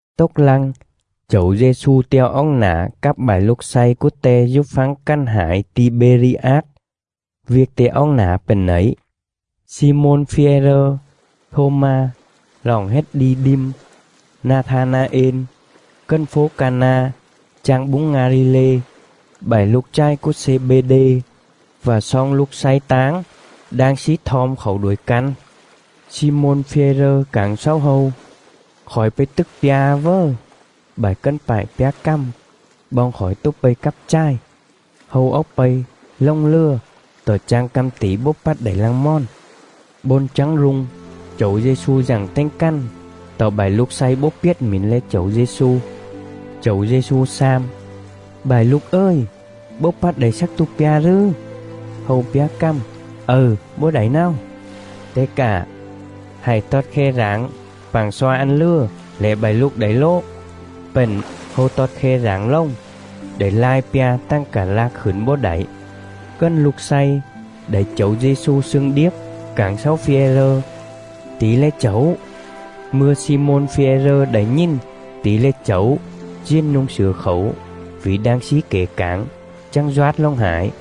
Tốc lăng, Chẩu Dê-xu te̱o oóc nả cắp bại lục slay cúa Te dú phắng cằn hải Ti-bê-ri-át. Viêc Te oóc nả pện nẩy: Xi-môn Phi-e-rơ, Thô-ma roọng hết Đi-đim, Na-tha-na-ên, cần fố Ca-na chang búng Nga-li-lê, bại lục chài cúa Xê-bê-đê, vạ sloong lục slay táng đang slí thom khảu đuổi căn. Xi-môn Phi-e-rơ cảng xáu hâu: “Khỏi pây tức pja a vớ.” Bại cần pại pjá cằm: “Boong khỏi tố pây cắp chài!” Hâu oóc pây, lồng lừa, tọ chang că̱m tỉ bấu pắt đảy lăng mòn.. Bôn chắng rung, Chẩu Dê-xu dặng tềnh cằn, tọ bại lục slay bấu piết mỉn le̱ Chẩu Dê-xu. Chẩu Dê-xu xam: “Bại lục ời, bấu pắt đảy slắc tua pja rừ?” Hâu pjá cằm: “Ầư, bấu đảy náo.” Te cạ: “Hạy tọt khe rảng pạng sloa ăn lừa lẻ bại lục đảy lố.” Pện, hâu tọt khe rảng lồng, đảy lai pja tằng cạ lạc khửn bấu đảy.. Cần lục slay đảy Chẩu Dê-xu slương điếp cảng xáu Phi-e-rơ: “Tỉ le̱ Chẩu!” Mư̱a Xi-môn Phi-e-rơ đảy nhìn tỉ le̱ Chẩu diền nu̱ng slửa khảu (vỉ đang slí kẻ cảng), chắng doát lồng hải.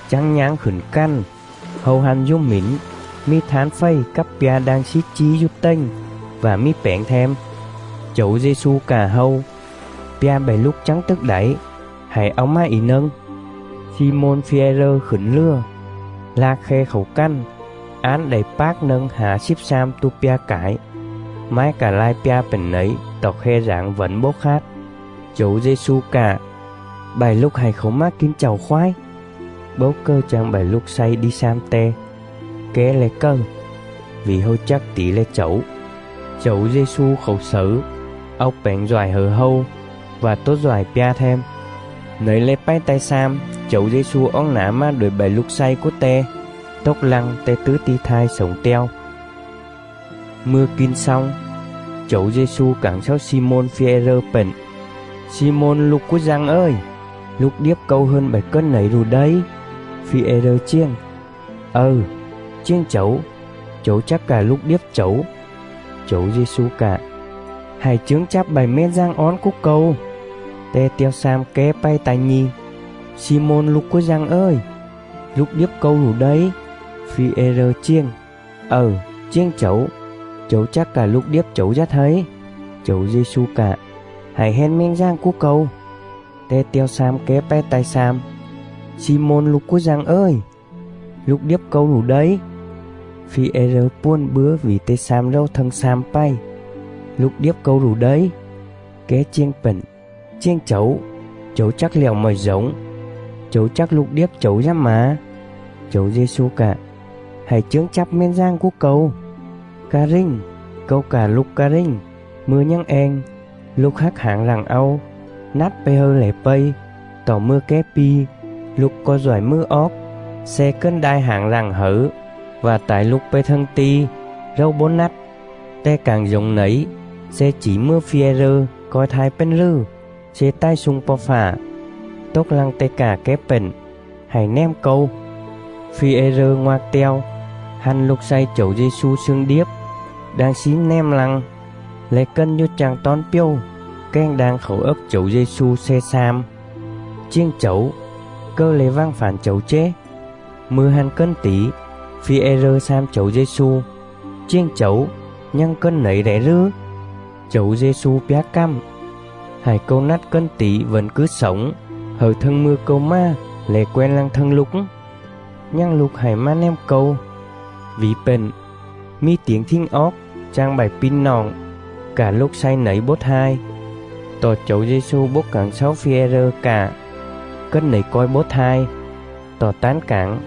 Chắng nháng khửn cằn, hâu hăn dú mỉn mì thán fầy cắp pja đang slí chí dú tềnh, vạ mì pẻng them. Chẩu Dê-xu cạ hâu: “Pja bại lục chắng tức đảy, hạy au mà ỉ nâng.” Xi-môn Phi-e-rơ khửn lừa, lạc khe khảu cằn, án đảy pác nâng hả slíp slam tua pja cải. Mái cạ lai pja pện nẩy tọ khe rảng vẩn bấu khát. Chẩu Dê-xu cạ: “Bại lục hạy khảu mà kin chạu khoái.” Bấu cầư chang bại lục slay đi xam Te: “Ké le̱ cầư?” Vỉ hâu chắc tỉ le̱ Chẩu. Chẩu Dê-xu khảu xẩư, au pẻng doại hẩư hâu, vạ tố doại pja them. Nẩy le̱ pày ta̱i slam Chẩu Dê-xu oóc nả mà đuổi bại lục slay cúa Te, tốc lăng Te tứ ti̱ thai slổng te̱o. Mư̱a kin xong, Chẩu Dê-xu cảng xáu Xi-môn Phi-e-rơ pện: “Xi-môn lục cúa Dăng ời, lục điếp Câu hơn bại cần nẩy rụ đây?” Phi-e-rơ chiềng: “Ầư, chiềng Chẩu, Chẩu chắc cạ lục điếp Chẩu.” Chẩu Dê-xu cạ: “Hạy chướng chắp bại mèn dàng ón cúa Câu.” Te te̱o xam ké pày ta̱i nhi̱: “Xi-môn lục cúa Dăng ời, lục điếp Câu rụ đây?” Phi-e-rơ chiềng: “Ầư, chiềng Chẩu, Chẩu chắc cạ lục điếp Chẩu dá thây.” Chẩu Dê-xu cạ: “Hạy hen mèn dàng cúa Câu.” Te te̱o xam ké pày ta̱i slam: “Xi-môn lục cúa Dăng ời, lục điếp Câu rụ đây?” Phi-e-rơ puồn bứa vỉ Te xam rầu thâng slam pày: “Lục điếp Câu rụ đây?” Ké chiềng pện: “Chiềng Chẩu, Chẩu chắc lẹo mọi dổng; Chẩu chắc lục điếp Chẩu dá mả.” Chẩu Dê-xu cạ: “Hạy chướng chắp mèn dàng cúa Câu. Ca rình, Câu cạ lục ca rình, mư̱a nhằng eng, lục hác hảng rặng au, nắt pây hâư lẻ pây; tọ mư̱a ké pi, lục co̱i doại mừ oóc, sle cần đai hảng rặng hẩư vạ tải lục pây thâng ti̱ rầu bấu nắt.” Te cảng dổng nẩy sle chỉ mừa Phi-e-rơ co̱i thai pền rừ sle tài slung Po̱ Fạ. Tốc lăng Te cạ ké pện: “Hạy nèm Câu.” Phi-e-rơ ngoạc te̱o, hăn lục slay Chẩu Dê-xu slương điếp đang slí nèm lăng, le̱ cần dú chang tón pjầu kèng đang khảu ấc Chẩu Dê-xu sle xam: “Chiềng Chẩu, cầư le̱ vằng fản Chẩu chế?”. Mư̱a hăn cần tỉ, Phi-e-rơ xam Chẩu Dê-xu: “Chiềng Chẩu, nhằng cần nẩy lẻ rừ?” Chẩu Dê-xu pjá cằm: “Hại Câu nắt cần tỉ vẩn cứ slổng hẩư thâng mư̱a Câu mà lẻ quen lăng thâng lục? Nhằng lục hạy mà nèm Câu.” Vỉ pện, mì tiểng thình oóc chang bại pi̱ noọng cạ lục slay nẩy bấu thai. Tọ Chẩu Dê-xu bấu cảng xáu Phi-e-rơ cạ: “Cần nẩy co̱i bấu thai,” tọ tán cảng: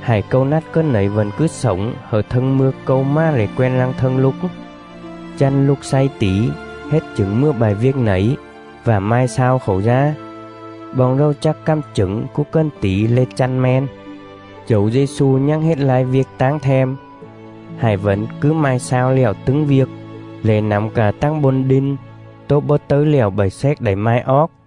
“Hại Câu nắt cần nẩy vẩn cứ slổng hẩư thâng mư̱a Câu mà lẻ quen lăng thâng lục?” Chăn lục slay tỉ hết chửng mừa bại viêc nẩy, vạ mai slao khảu dá. Boong rầu chắc cằm chửng cúa cần tỉ le̱ chăn me̱n. Chẩu Dê-xu nhằng hết lai viêc táng them. Hại vẩn cứ mai slao lẹo tứng viêc, lẻ nẳm cạ tằng bôn đin tố bấu tấư lẹo bại xéc đảy mai oóc.